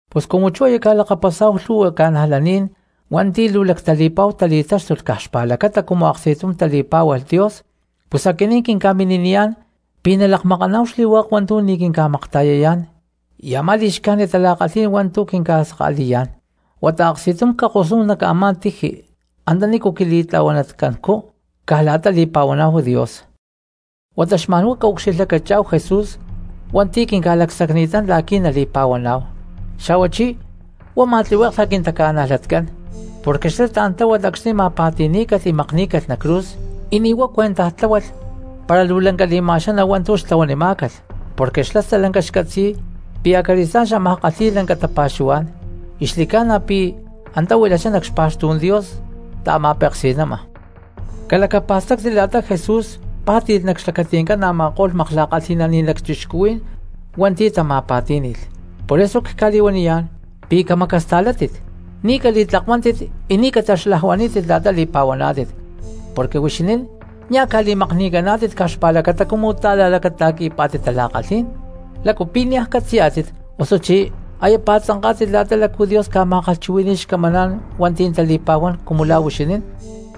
Pus cumu chú aya ca̠lakapasá̠hu lhu̠hua cristianos hua̠nti̠ luu lactali̠pa̠hu tali̠táxtulh caj xpa̠lacata cumu aksti̠tum tali̠pá̠hualh Dios pus aquinín quinca̠mini̠niyá̠n pi̠ na̠ calakmakáhu xli̠hua̠k hua̠ntu̠ ni̠ quinca̠makta̠yayá̠n y a̠má li̠xcájnit tala̠kalhí̠n hua̠ntu̠ quinca̠saka̠li̠yá̠n, huata aksti̠tum cakosnúhu nac a̠má tiji antanícu quili̠tla̠huanatcancú caj la̠ta li̠pa̠huaná̠hu Dios. Huata xma̠n huá caucxilhlacachá̠hu Jesús hua̠nti̠ quinca̠lacsacni̠tán la̠qui̠ nali̠pa̠huaná̠hu, xa̠huachí huá ma̠tlihueklha quintaca̠najlatcán. Porque xlá tla̠n tláhualh acxni̠ ma̠pa̠ti̠ní̠calh y makní̠calh nac cruz, y ni̠ huá cuentaj tláhualh para luu lanca li̠ma̠xaná hua̠ntu̠ xtlahuanimá̠calh porque xlá stalanca xcatzi̠y pi̠ acali̠stá̠n xámaj kalhi̠y lanca tapa̠xuhuá̠n, y xli̠ca̠na pi̠ chú antá huilachá nac xpa̠xtú̠n Dios ta̠ma̠peksi̠ma. Calacapa̠stáctit la̠ta Jesús pá̠ti̠lh nac xlacati̠ncán a̠ma̠ko̠lh makla̠kalhi̠naní̠n lacchixcuhuí̠n hua̠ntu̠ tama̠pa̠tí̠ni̠lh, por eso cca̠li̠huaniyá̠n pi̠ camacasta̠látit, ni̠ cali̠tlakuántit y ni̠ cataxlajuaní̠tit la̠ta li̠pa̠huaná̠tit. Porque huixinín nia̠ ca̠li̠makni̠caná̠tit caj xpa̠lacata cumu ta̠la̠lacata̠qui̠pá̠tit tala̠kalhí̠n. ¿Lácu pi̠ niaj catzi̠yá̠tit osuchí aya pa̠tzanká̠tit lácu Dios ca̠ma̠kalhchuhui̠ni̠y xcamaná̠n hua̠nti̠ tali̠pa̠huán cumu lá huixinín?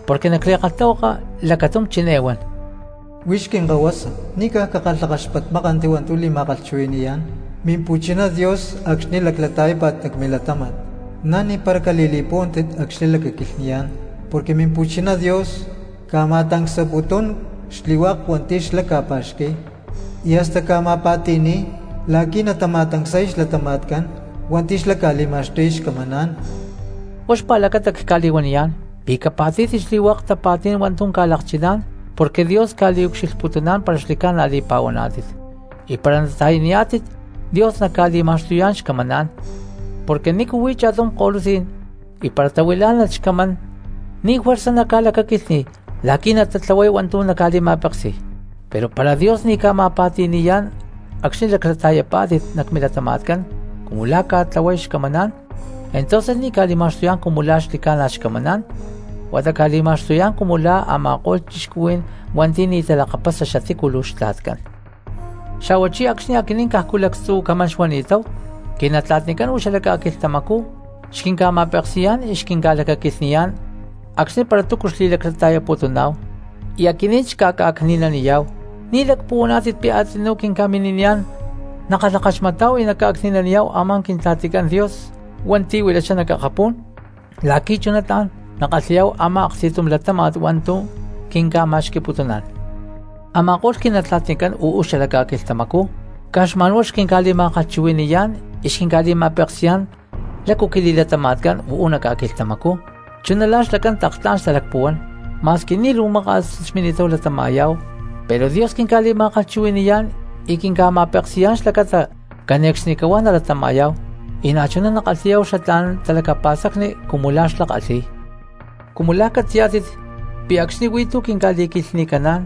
Porque nac li̠kalhtahuaka lacatum chiné huan: Huix quinkahuasa, ni̠ caj cakalhakaxpatmákanti hua̠ntu̠ li̠ma̠kalhchuhui̠ni̠yá̠n Mimpu̠china Dios acxni̠ laclata̠yápa̠t nac milatáma̠t, na̠ ni̠para cali̠li̠púhuanti acxni̠ lacaquilhni̠yá̠n. Porque Mimpu̠chiná Dios ca̠ma̠tancsaputún xli̠hua̠k hua̠nti̠ xlá ca̠pa̠xqui̠y, y hasta ca̠ma̠pa̠ti̠ni̠y la̠qui̠ natama̠tancsay xlatama̠tcán hua̠nti̠ xlá ca̠li̠ma̠xtuy xcamaná̠n. Huá xpa̠lacata cca̠li̠huaniyá̠n pi̠ capa̠tí̠tit xli̠hua̠k tapa̠tí̠n hua̠ntu̠ ca̠lakchiná̠n porque Dios ca̠ucxilhputuná̠n para xli̠ca̠na li̠pa̠huaná̠tit, y para nata̠yaniyá̠tit Dios naca̠li̠ma̠xtuyá̠n xcamaná̠n. Porque ¿nícu huí cha̠tum ko̠lutzí̠n y para tahuilá̠nalh xcamán ni̠ juerza naca̠lacaquilhní̠y la̠qui̠ natatlahuay hua̠ntu̠ naca̠li̠ma̠peksi̠y? Pero para Dios ni̠ ca̠ma̠pa̠ti̠ni̠yá̠n acxni̠ laclata̠yapá̠tit nac milatama̠tcán cumu la̠ ca̠tlahuay xcamaná̠n, entonces ni̠ ca̠li̠ma̠xtuyá̠n cumu la̠ xaxli̠ca̠na xcamaná̠n, huata ca̠li̠ma̠xtuyá̠n cumu la̠ a̠ma̠ko̠lh cristianos hua̠nti̠ ni̠ talakapasa xatícu luu xtla̠tcán. Xa̠huachí acxni̠ aquinín cajcu lactzu̠ camán xuani̠táhu, quinatla̠tnicán uú xala ca̠quilhtamacú xquinca̠ma̠peksi̠yá̠n y xquinca̠lacaquilhni̠yá̠n acxni̠ para túcu xli̠laclata̠yaputuná̠hu, y aquinín xca̠ca̠cni̠naniyá̠hu. ¿Ni̠ lacpuhuaná̠tit pi̠ a̠tzinú quinca̠mini̠niyá̠n nakalhakaxmatá̠hu y naca̠cni̠naniyá̠hu a̠má Quintla̠ticán Dios hua̠nti̠ huilachá nac akapú̠n la̠qui̠ chuná tla̠n nakalhi̠yá̠hu a̠má aksti̠tum latáma̠t hua̠ntu̠ quinca̠ma̠xqui̠putuná̠n? Ama̠ko̠lh quinatla̠tnicán uú xala ca̠quilhtamacú caj xma̠n huá xquinca̠li̠ma̠kalhchuhui̠ni̠yá̠n y xquinca̠li̠ma̠peksi̠yá̠n lácu quili̠latama̠tcán uú nac ca̠quilhtamacú chuná la̠ xlacán tlak tla̠n xtalacpuhuán, ma̠squi ni̠ luu maka̠s xmini̠táhu latama̠yá̠hu, pero Dios quinca̠li̠ma̠kalhchuhui̠ni̠yá̠n y quinca̠ma̠peksi̠yá̠n xlacata cane̠cxnicahuá nalatama̠yá̠hu, y na̠chuná nakalhi̠yá̠hu xatlá̠n talacapa̠stacni cumu la̠ xlá kalhi̠y. Cumu la̠ catzi̠yá̠tit pi̠ acxni̠ huí tú quinca̠li̠quilhni̠caná̠n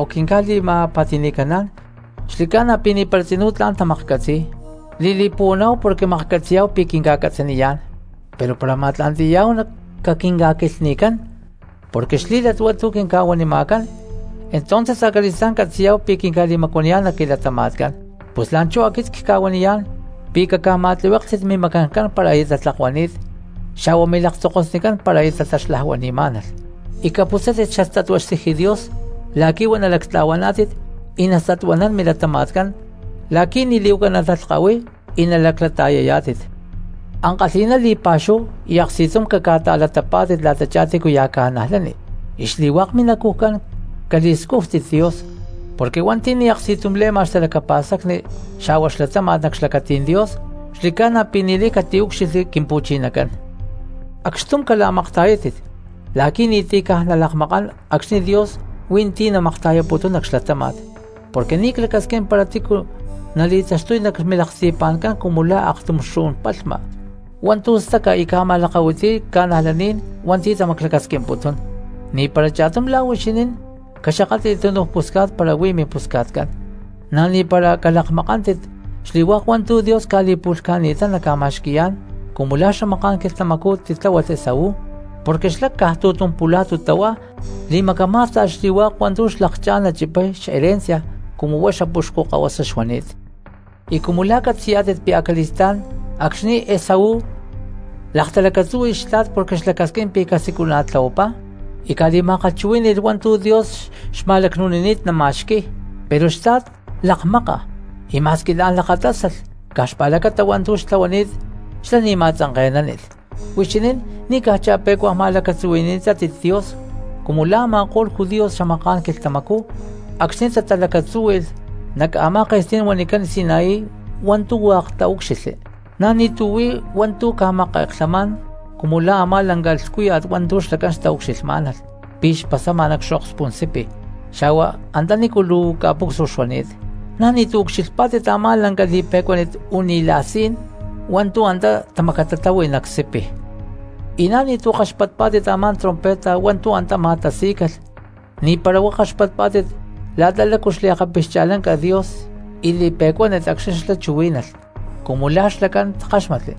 o quinca̠li̠ma̠pa̠ti̠ni̠caná̠n xli̠ca̠na pi̠ ni̠para tzinú tla̠n tamaklhcatzi̠y, li̠li̠puhuaná̠hu porque maklhcatzi̠yá̠hu pi̠ quinca̠catzaniyá̠n, pero para ma̠tla̠nti̠yá̠hu caquinca̠quilhni̠cán porque xlí̠lat hua̠ntu̠ quinca̠huanima̠cán entonces acali̠stá̠n catzi̠yá̠hu pi̠ quinca̠li̠macuaniyá̠n nac quilatama̠tcán. Pus la̠nchú aquit cca̠huaniyá̠n pi̠ caca̠ma̠tlihuéklhtit mimacancán para aya tatlakuani̠t, xa̠hua milaktzokosnicán para taxlajuanamá̠nalh, y caputzátit xastatua xtiji Dios la̠qui̠ huá nalactla̠huaná̠tit y nastatuanán milatama̠tcán la̠qui̠ ni̠ li̠huaca natalhkahuiy y nalaclata̠yayá̠tit. Ankalhi̠ná li̠pa̠xúhu y aksti̠tum caca̠ta̠latapá̠tit la̠tachá tícuya̠ cristianos y xli̠hua̠k minacujcán cali̠scújtit Dios, porque hua̠nti̠ ni̠ aksti̠tum le̠ma xtalacapa̠stacni xa̠hua xlatáma̠t nac xlacatí̠n Dios xli̠ca̠na pi̠ ni̠lay catiúcxilhli Quimpu̠chinacán. Acxtum cala̠makta̠yátit la̠qui̠ ni̠ti̠ caj nalakmakán acxni̠ Dios hui̠ntí namakta̠yaputún nac xlatáma̠t, porque ni̠ clacasquín para tícu nali̠taxtuy nac milaksti̠pa̠ncán cumu la̠ akatum xu̠n palhma hua̠ntu̠ staca y ca̠ma̠lakahuitiy cristianos hua̠nti̠ tamaclacasquimputún. Ni̠para cha̠tum la̠ huixinín caxakátli̠lh túnuj pusca̠t para huí mimpusca̠tcán, na̠ ni̠para calakmakántit xli̠hua̠k hua̠ntu̠ Dios ca̠li̠pu̠lhca̠ni̠tán naca̠ma̠xqui̠yá̠n cumu la̠ xamaká̠n quilhtamacú titláhualh Esaú, porque xlá caj tu̠tum pula̠tu tahuá li̠macamá̠sta̠lh xli̠hua̠k hua̠ntu̠ xlakchá̠n nachipay xherencia cumu huá xapuxcu kahuasa xuani̠t. Y cumu la̠ catzi̠yá̠tit pi̠ acali̠stá̠n acxni̠ Esaú laktalacatzúhui̠lh xtla̠t porque xlacasquín pi̠ casiculana̠tlahuapá y cali̠ma̠kalhchuhuí̠ni̠lh hua̠ntu̠ Dios xma̠lacnu̠nini̠t nama̠xqui̠y, pero xtla̠t lakmáka, y ma̠squi la̠n lakatásalh caj xpa̠lacata hua̠ntu̠ xtlahuani̠t xlá ni̠ ma̠tzanke̠nánilh. Huixinín ni̠ caj cha̠pe̠cua ma̠lacatzuhui̠ni̠tátit Dios cumu la̠ a̠ma̠ko̠lh judíos xamaká̠n quilhtamacú acxni̠ tatalacatzúhui̠lh nac a̠má ke̠stí̠n huanicán Sinaí hua̠ntu̠ hua̠k taúcxilhli. Na̠ ni̠tu̠ huí hua̠ntu̠ ca̠make̠klhamá̠n cumu lá a̠má lanca lhcúya̠t hua̠ntu̠ xlacán xtaucxilhmá̠nalh pi̠ xpasama nac xokspú̠n sipi xa̠hua antanícu luu ca̠pucsua xuani̠t, na̠ ni̠tu̠ ucxilhpá̠tit a̠má lanca y li̠pe̠cuánit u̠ni̠la̠sé̠n hua̠ntu̠ antá tamacatatáhui nac sipi. Y na̠ ni̠tu̠ kaxpatpá̠tit a̠má trompeta hua̠ntu̠ antá ma̠tasí̠calh, ni̠para huá kaxpatpá̠tit la̠ta lácu xli̠pixcha̠lanca Dios y li̠pe̠cuánit acxni̠ xlá chuhuí̠nalh cumu la̠ xlacán takáxmatli,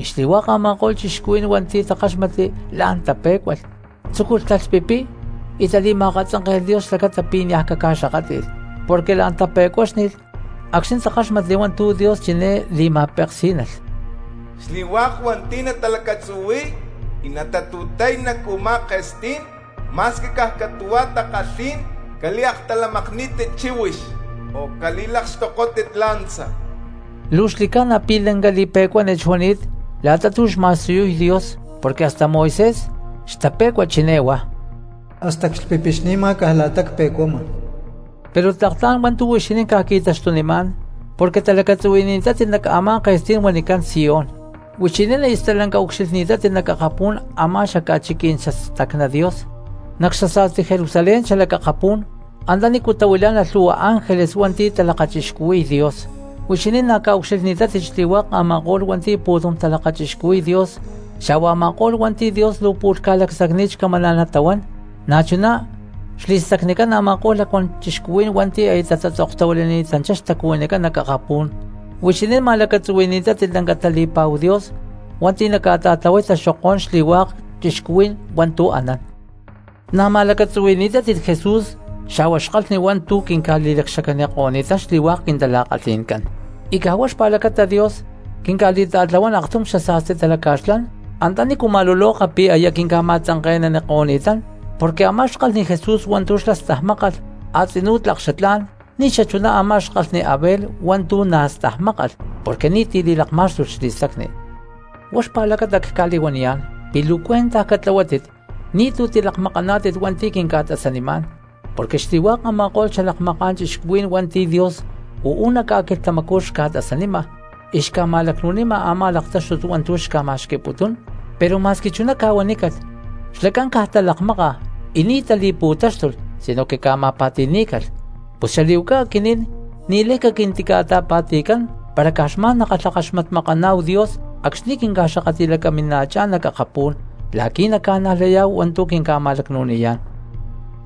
y xli̠hua̠k a̠ma̠ko̠lh cristianos hua̠nti̠ takáxmatli la̠n tape̠cualh, tzúculh talhpipiy y tali̠ma̠akatzánke̠lh Dios xlacata pi̠ niaj caca̠xakátli̠lh, porque la̠n tape̠cuáxni̠lh acxni̠ takáxmatli hua̠ntu̠ Dios chiné li̠ma̠peksí̠nalh: “Xli̠hua̠k hua̠nti̠ natalacatzuhui̠y y natatu̠tay nac u̠má ke̠stí̠n, ma̠squi caj catu̠hua takalhí̠n, cali̠actalamakní̠tit chíhuix o cali̠lakxtokótit lanza.” Luu xli̠ca̠na pi̠ lanca li̠pe̠cuánit xuani̠t la̠ta tu̠ xma̠siyuy Dios porque hasta Moisés xtape̠cua chiná huá: “Hasta clhpipixni̠ma caj la̠ta cpe̠cuama.” Pero tlak tla̠n hua̠ntu̠ huixinín ca̠qui̠taxtunimá̠n porque talacatzuhui̠ni̠tátit nac a̠má ke̠stí̠n huanicán Sión, huixinín aya stalanca ucxilhni̠tátit nac akapú̠n a̠má xca̠chiquí̠n xastacná Dios, nac xasa̠sti Jerusalén xalac akapú̠n antanícu tahuilá̠nalh lhu̠hua ángeles hua̠nti̠ talakachixcuhui̠y Dios. Huixinín na̠ ca̠ucxilhni̠tátit xli̠hua̠k a̠ma̠ko̠lh hua̠nti̠ pu̠tum talakachixcuhui̠y Dios xa̠hua a̠ma̠ko̠lh hua̠nti̠ Dios luu pu̠lh ca̠lacsacni̠t xcamaná̠n natahuán, na̠chuná xli̠stacnicán a̠ma̠ko̠lh lacuán cristianos hua̠nti̠ aya tatzoktahuilani̠tanchá xtacuhuinicán nac akapú̠n, huixinín ma̠lacatzuhui̠ni̠tátit lanca tali̠pa̠hu Dios hua̠nti̠ naca̠ta̠tlahuay taxokó̠n xli̠hua̠k cristianos hua̠ntu̠ anán. Na̠ ma̠lacatzuhui̠ni̠tátit Jesús xa̠hua xkalhni hua̠ntu̠ quinca̠li̠lacxacaniko̠ni̠tán xli̠hua̠k quintala̠kalhi̠ncán, y caj huá xpa̠lacata Dios quinca̠ta̠tlahuán aktum xasa̠sti talaca̠xlán antanícu ma̠luloka pi̠ aya quinca̠ma̠tzanke̠naniko̠ni̠tán, porque a̠má xkalhni Jesús hua̠ntu̠ xlá stajmákalh a̠tzinú tlak xatlá̠n ni̠ xachuná a̠má xkalhni Abel hua̠ntu̠ na̠ xlá stajmákalh, porque ni̠ti̠ li̠lakma̠xtúnilh xli̠stacni. Huá xpa̠lacata cca̠li̠huaniyá̠n pi̠ luu cuentaj catlahuátit ni̠tu̠ tilakmakaná̠tit hua̠nti̠ quinca̠tasanimá̠n, porque xli̠hua̠k a̠ma̠ko̠lh xalakmaká̠n cristianos hua̠nti̠ Dios uú nac ca̠quilhtamacú xca̠tasanima y xca̠ma̠lacnu̠nima a̠má laktáxtut hua̠ntu̠ xca̠ma̠xqui̠putún, pero ma̠squi chuná ca̠huanícalh xlacán caj talakmáka y ni̠ tali̠pu̠táxtulh sinoque ca̠ma̠pa̠ti̠ní̠calh; pus xali̠huaca aquinín ni̠lay caquintica̠ta̠pa̠ti̠cán para caj xma̠n kalhakaxmatmakaná̠hu Dios acxni̠ quinca̠xakatli̠lacamima̠chá̠n nac akapú̠n la̠qui̠ naca̠najlayá̠hu hua̠ntu̠ quinca̠ma̠lacnu̠niyá̠n.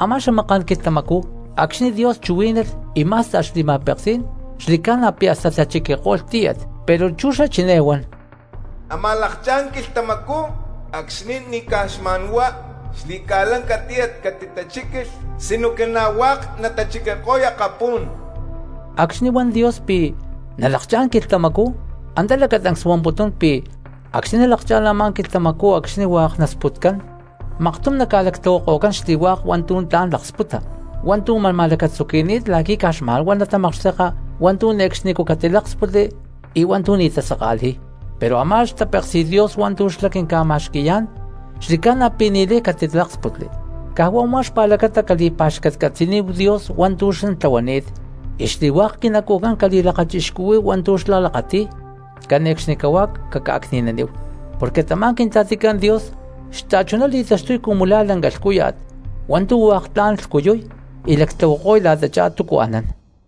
Amá xamaká̠n quilhtamacú acxni̠ Dios chuhuí̠nalh y má̠sta̠lh xli̠ma̠peksí̠n xli̠ca̠na pi̠ hasta tachiquiko̠lh tíyat, pero chú xlá chiné huan: “Amaj lakchá̠n quilhtamacú acxni̠ ni̠ caj xma̠n huá xli̠ca̠lanca ca̠tiyatni catitachíquilh sinoque na̠ hua̠k natachiquiko̠y akapú̠n.” Acxni̠ huan Dios pi̠ “nalakchá̠n quilhtamacú”, antá lacatancs huamputún pi̠ acxni̠ nalakchá̠n a̠má quilhtamacú acxni̠ hua̠k nasputcán maktum naca̠lactlahuako̠cán xli̠hua̠k hua̠ntu̠ tla̠n laksputa, hua̠ntu̠ ma̠n ma̠lacatzuqui̠ni̠t la̠qui̠ caj xma̠n huá natamakxteka hua̠ntu̠ ne̠cxnicú catiláksputli y hua̠ntu̠ ni̠ tasaka̠li̠y. Pero a̠má xtapéksi̠t Dios hua̠ntu̠ xlá quinca̠ma̠xqui̠yá̠n xli̠ca̠na pi̠ ni̠lay catiláksputli, caj huá u̠má xpa̠lacata cali̠pa̠xcatcatzi̠níhu Dios hua̠ntu̠ xlá tlahuani̠t, y xli̠hua̠k quinacujcán cali̠lakachixcuhuí̠hu hua̠ntu̠ xlá lakati̠y, cane̠cxnicahuá caca̠cni̠naníhu. Porque tamá Quintla̠ticán Dios xta̠chuná li̠taxtuy cumu lá lanca lhcúya̠t hua̠ntu̠ hua̠k tla̠n lhcuyuy y lactlahuako̠y la̠tachá túcu anán.